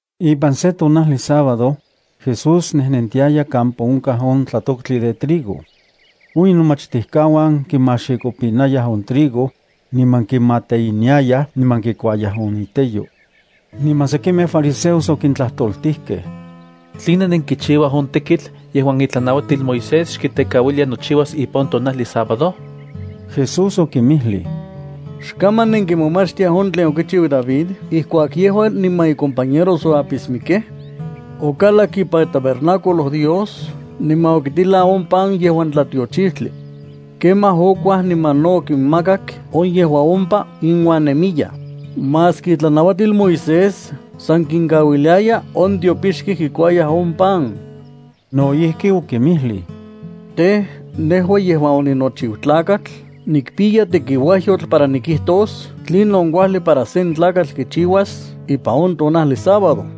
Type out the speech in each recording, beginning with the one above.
Ipan sen tonajli sábado, Jesús nejnentiaya kampa onkaj on tlatoktli de trigo. On inomachtijkauan kimaxikopinayaj on trigo, niman kimateiniayaj niman kikuayaj on iteyo. Niman sekimej fariseos okintlajtoltijkej: —¿Tline nenkichiuaj on tekitl yejuan itlanauatil Moisés xkitekauilia nochiuas ipan on tonajli sábado? Jesús okinmijlij: —¿Xkaman nenkimomachtiaj on tlen okichiu David ijkuak yejua niman icompañeros oapismikej? Okalak ipan itabernáculo Dios niman okitilan on pan yejuan tlatiochijtli. Kemaj okuaj niman no okinmakak on yejuan ompa inuan nemiyaj, maski itlanauatil Moisés san kinkauiliaya on tiopixkej kikuayaj on pan. No ijki okinmijlij: —Tej, nejua yejuan oninochiu Tlakatl nikpiya tekiuajyotl para nikijtos tlinon kuajli para sen tlakatl kichiuas ipan on tonajli sábado.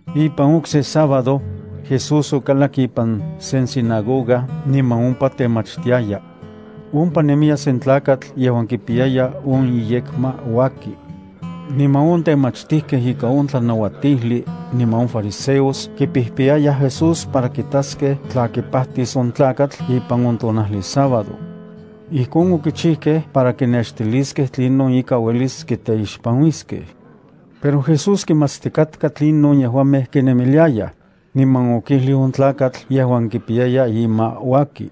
Ipan okse sábado, Jesús okalak ipan sen sinagoga niman ompa temachtiaya. Ompa nemiya sen tlakatl yejuan kipiyaya on iyekma uaki. Niman on temachtijkej ikan on tlanauatijli niman on fariseos kipijpiyayaj Jesús para kitaskej tla kipajtis on tlakatl ipan on tonajli sábado. Ijkon okichijkej para kinextiliskej tlinon ika uelis kiteixpanuiskej. Pero Jesús kimatstikatka tlinon yejuamej kinemiliayaj, niman okijlij on tlakatl yejuan kipiyaya ima uaki: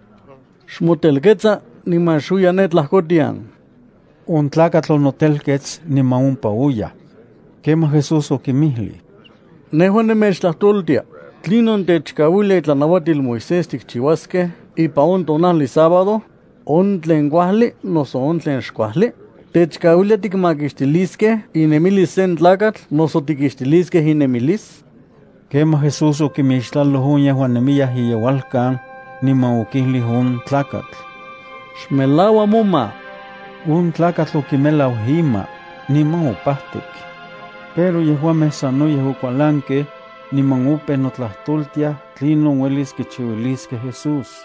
—Xmotelketsa niman xuiya ne tlajkotian. On tlakatl onotelkets niman ompa oyaj. Kemaj Jesús okinmijlij: —Nejua nemechtlajtoltia: ¿Tlinon techkauilia itlanauatil Moisés tikchiuaskej ipan on tonajli sábado, on tlen kuajli noso on tlen xkuajli? ¿Techkauilia tikmakixtiliskej inemilis sen tlakatl noso tikixtiliskej inemilis? Kemaj Jesús okimixtlaloj on yejuan nemiyaj iyeualkan, niman okijlij on tlakatl: —Xmelaua moma. On tlakatl okimelau ima, niman opajtik. Pero yejuamej sanoyej okualankej, niman opeu notlajtoltiaj tlinon uelis kichiuiliskej Jesús.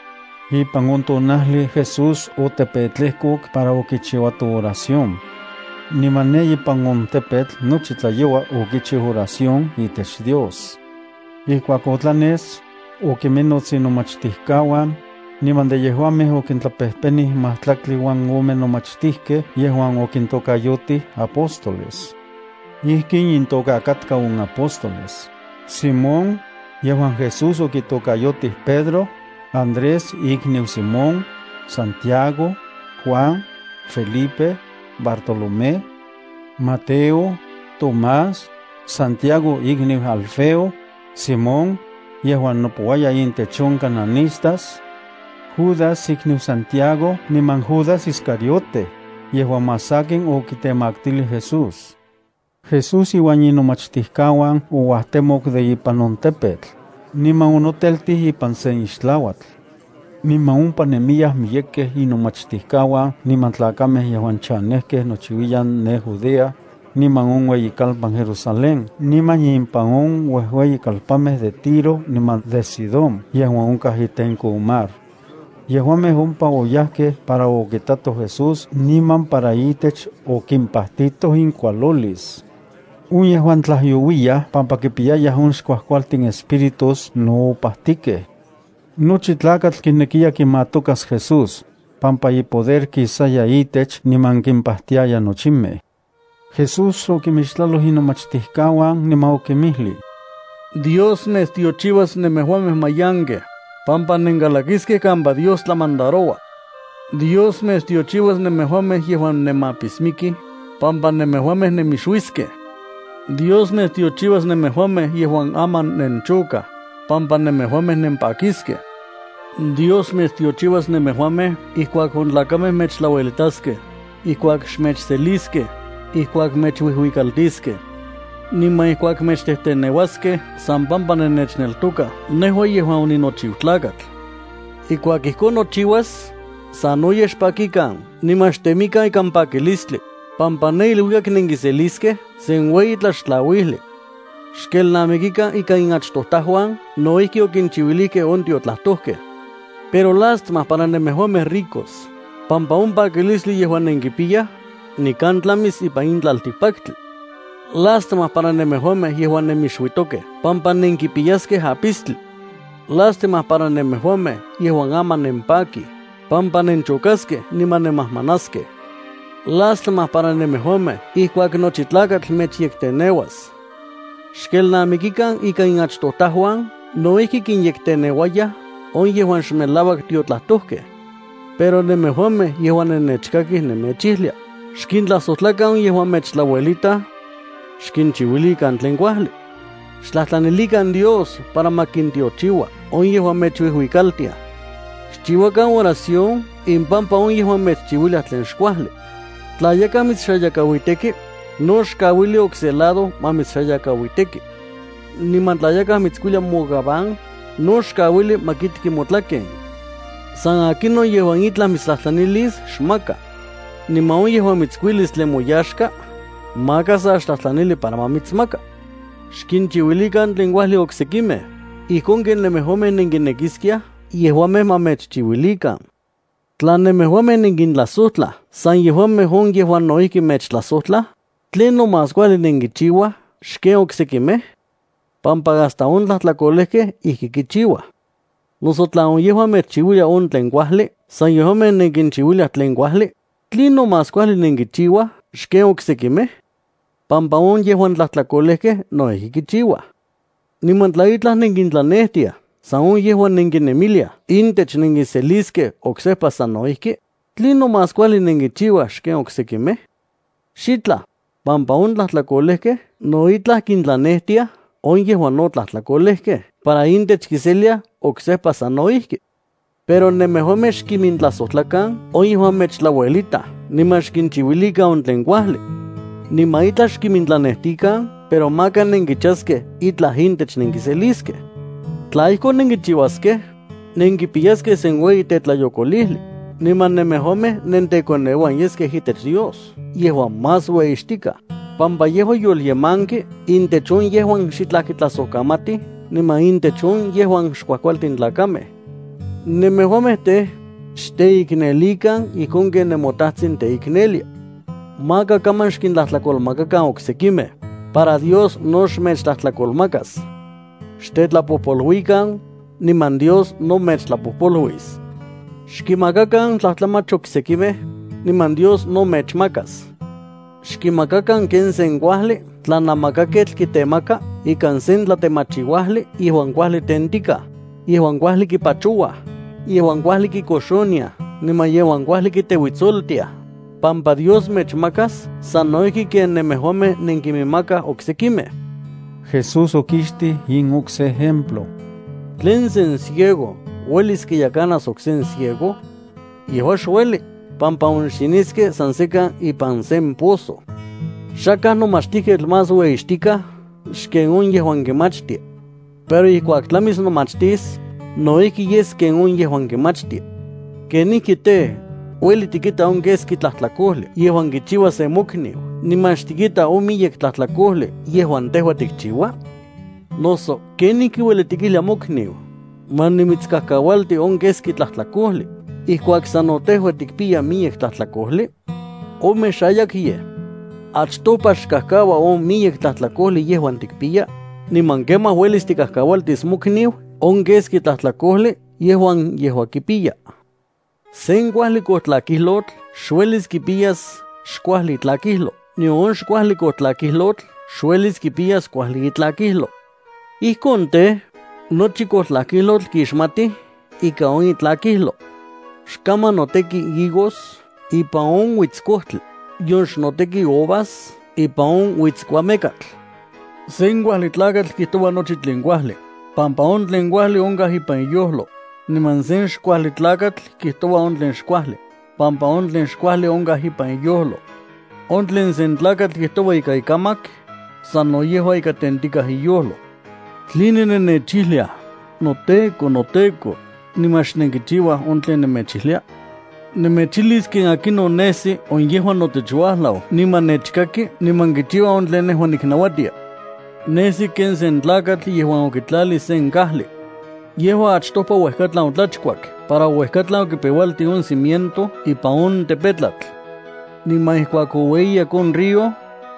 Ipan on tonajli Jesús otepetlejkok para okichiuato oración. Niman ne ipan on tepetl nochi tlayoua okichiu oración itech Dios. Ijkuak otlanes, okiminnots inomachtijkauan, niman de yejuamej okintlapejpenij majtlaktli uan ome nomachtijkej yejuan okintokayotij apóstoles. Ijkin intoka katka on apóstoles: Simón, yejuan Jesús okitokayotij Pedro, Andrés ikniu Simón, Santiago, Juan, Felipe, Bartolomé, Mateo, Tomás, Santiago ikoneu Alfeo, Simón, yejuan nopouaya intech on cananistas, Judas ikniu Santiago niman Judas Iscariote, yejuan más sakin okitemaktilij Jesús. Jesús iuan inomachtijkauan ouajtemok de ipan on tepetl, niman onoteltij ipan sen ixtlauatl. Niman ompa nemiyaj miyekej inomachtijkauan niman tlakamej yejuan chanejkej nochiuiyan ne Judea, niman on ueyikalpan Jerusalén niman ipan on ueyikalpanmej de Tiro niman de Sidón yejuan onkaj itenko on mar. Yejuamej ompa oyajkej para okakitoj Jesús niman para itech okimpajtitoj inkualolis. On yejuan tlajyouiyaj pampa kipiyayaj on xkuajkualtin espíritus no opajtikej. Nochi tlakatl kinekiya kimatokas Jesús, pampa ipoder kisaya itech niman kimpajtiaya nochimej. Jesús okimixtlaloj inomachtijkauan niman okinmijlij: —Dios mechtiochiuas nemejuamej mayankej, pampa nenkalakiskej kampa Dios tlamandaroua. ’Dios mechtiochiuas nemejuamej yejuan nemapismikij, pampa nemejuamej nemixuiskej. ’Dios mechtiochiuas nemejuamej yejuan aman nenchokaj, pampa nemejuamej nempakiskej. ’Dios mechtiochiuas nemejuamej ijkuak on tlakamej mechtlauelitaskej, ijkuak xmechseliskej, ijkuak mechuijuikaltiskej, niman ijkuak mechtejteneuaskej san pampa nennechneltokaj nejua yejuan oninochiu Tlakatl. Ijkuak ijkon nochiuas, sanoyej xpakikan niman xtemikan ikan pakilistli, pampa ne iluikak nenkiseliskej sen ueyi tlaxtlauijli. Xkelnamikikan ika inachtojtajuan no ijki okinchiuilijkej on tiotlajtojkej. ’Pero lástima para nemejuamej ricos, pampa on pakilistli yejuan nenkipiyaj, nikan tlamis ipan in tlaltikpaktli. ’Lástima para nemejuamej yejuan nemixuitokej pampa nenkipiyaskej apistli. “Lástima para nemejuamej yejuan aman nempakij, pampa nenchokaskej niman nemajmanaskej. ’Lástima para nemejuamej ijkuak nochi tlakatl mechyekteneuas. Xkelnamikikan ika inachtojtajuan no ijki kinyekteneuayaj on yejuan xmelauak tiotlajtojkej. ’Pero nemejuamej yejuan nennechkakij nemechijlia: Xkintlajsojtlakan on yejuan mechtlauelitaj; xkinchiuilikan tlen kuajli. Xtlajtlanilikan Dios para ma kintiochiua on yejuan mechuijuikaltiaj; xchiuakan oración impampa on yejuan mechchiuiliaj tlen xkuajli. Tla yakaj mitsxayakauiteki, no xkauili okse lado ma mitsxayakauiteki. Niman tla yakaj mitskuilia mogabán, no xkauili ma kikti motlaken. San akinon yejuan itlaj mitstlajtlanilis, xmaka. Niman on yejuan mitskuilis tlen moyaxka, maka sa xtlajtlanili para ma mitsmaka. Xkinchiuilikan tlen kuajli oksekimej ijkon ken nemejuamej nenkinekiskiaj yejuamej ma mechchiuilikan. ’Tla nemejuamej nenkintlajsojtlaj san yejuamej on yejuan no ijki mechtlajsojtlaj, ¿tlinon más kuajli nenkichiuaj xken oksekimej?, pampa hasta on tlajtlakolejkej ijki kichiuaj. Noso tla on yejuan mechchiuiliaj on tlen kuajli san yejuamej nenkinchiuiliaj tlen kuajli, ¿tlinon más kuajli nenkichiuaj xken oksekimej?, pampa on yejuan tlajtlakolejkej no ijki kichiuaj. Niman tla itlaj nenkintlanejtiaj san on yejuan nenkinemiliaj intech nenkiseliskej oksejpa sano ijki, ¿tlinon más kuajli nenkichiuaj xken oksekimej? Xitlaj pampa on tlajtlakolejkej no itlaj kintlanejtiaj on yejuan no tlajtlakolejkej para intech kiseliaj oksejpa sano ijki. Pero nemejuamej xkimintlajsojtlakan on yejuan mechtlauelitaj niman xkinchiuilikan on tlen kuajli. Niman itlaj xkimintlanejtikan pero maka nenkichaskej itlaj intech nenkiseliskej. Tla ijkon nenkichiuaskej, nenkipiyaskej sen ueyi tetlayokolijli, niman nemejuamej nentekoneuan yeskej itech Dios yejuan más ueyixtikaj, pampa yejua yolyemanki intech on yejuan xitlaj kitlajsojkamatij niman intech on yejuan xkuajkualtin tlakamej. Nemejuamej tej, xteiknelikan ijkon ken nemoTajtsin teiknelia. ’Maka kaman xkintlajtlakolmakakan oksekimej, para Dios no xmechtlajtlakolmakas. Xtetlapojpoluikan, niman Dios no mechtlapojpoluis. Xkinmakakan tlajtlamach oksekimej, niman Dios no mechmakas. Xkinmakakan ken sen kuajli tlanamakaketl kitemaka ikan sen tlatemachiuajli yejuan kuajli tentikaj, yejuan kuajli kipachouaj, yejuan kuajli kikoxoniaj niman yejuan kuajli kiteuitsoltiaj, pampa Dios mechmakas sano ijki ken nemejuamej nenkiminmakaj oksekimej. Jesús okixtij in okse ejemplo: —¿Tlen sen ciego uelis kiyekanas okse ciego? Yejua xueli, pampa onxiniskej san sekan ipan sen pozo. Xakaj nomachtijketl más ueyixtikaj xken on yejuan kimachtia. Pero ijkuak tlamis nomachtis, no ijki yes ken on yejuan kimachtia. ’¿Kenijki tej, ueli tikita on keski tlajtlakojli yejuan kichiua sen mokniu niman xtikita on miyek tlajtlakojli yejuan tejua tikchiua? Noso, ¿kenijki ueli tikijlia mokniu: “Ma nimitskajkaualti on keski tlajtlakojli”, ijkuak sano tejua tikpiya miyek tlajtlakojli? ¡Omexayakyej! Achtopa xkajkaua on miyek tlajtlakojli yejuan tikpiya, niman kemaj uelis tikajkaualtis mokniu on keski tlajtlakojli yejuan yejua kipiya. ’Sen kuajli kojtlakijlotl xuelis kipiyas xkuajli itlakijlo nion on xkuajli kojtlakijlotl xuelis kipiyas kuajli itlakijlo. Ijkon tej, nochi kojtlakijlotl kixmatij ika on itlakijlo. Xkaman noteki higos ipan on uitskojtli, nion xnoteki uvas ipan on uitskuamekatl. Sen kuajli tlakatl kijtoua nochi tlen kuajli, pampa on tlen kuajli onkaj ipan iyojlo, niman sen xkuajli tlakatl kijtoua on tlen xkuajli, pampa on tlen xkuajli onkaj ipan iyojlo. On tlen sen tlakatl kijtoua ikan ikamak, sano yejua ika tentikaj iyojlo. ’¿Tline nennechijliaj, “noTEKO, noTEKO”, niman xnenkichiuaj on tlen nemechijlia? Nemechijlis ken akinon nesi on yejuan notech uajlau niman nechkaki niman kichiua on tlen nejua nitlanauatia. Nesi ken sen tlakatl yejuan okitlalij sen kajli. Yejua achtopa uejkatlan otlachkuak para uejkatlan okipeualtij on cimiento ipan on tepetlatl. Niman ijkuak oueyiyak on río,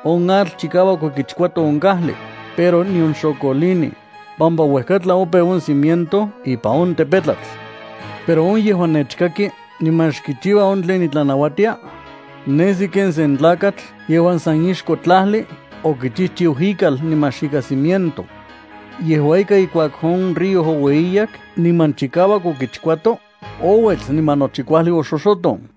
on atl chikauak okichkuato on kajli, pero nion xokolinij, pampa uejkatlan opeu on cimiento ipan on tepetlatl. Pero on yejuan nechkaki niman xkichiua on tlen nitlanauatia, nesi ken sen tlakatl yejuan san ixko tlajli okichijchiu ikal niman xikan cimiento. Yejua ika ijkuak on río oueyiyak niman chikauak okichkuato ouets, niman nochi kuajli oxoxoton.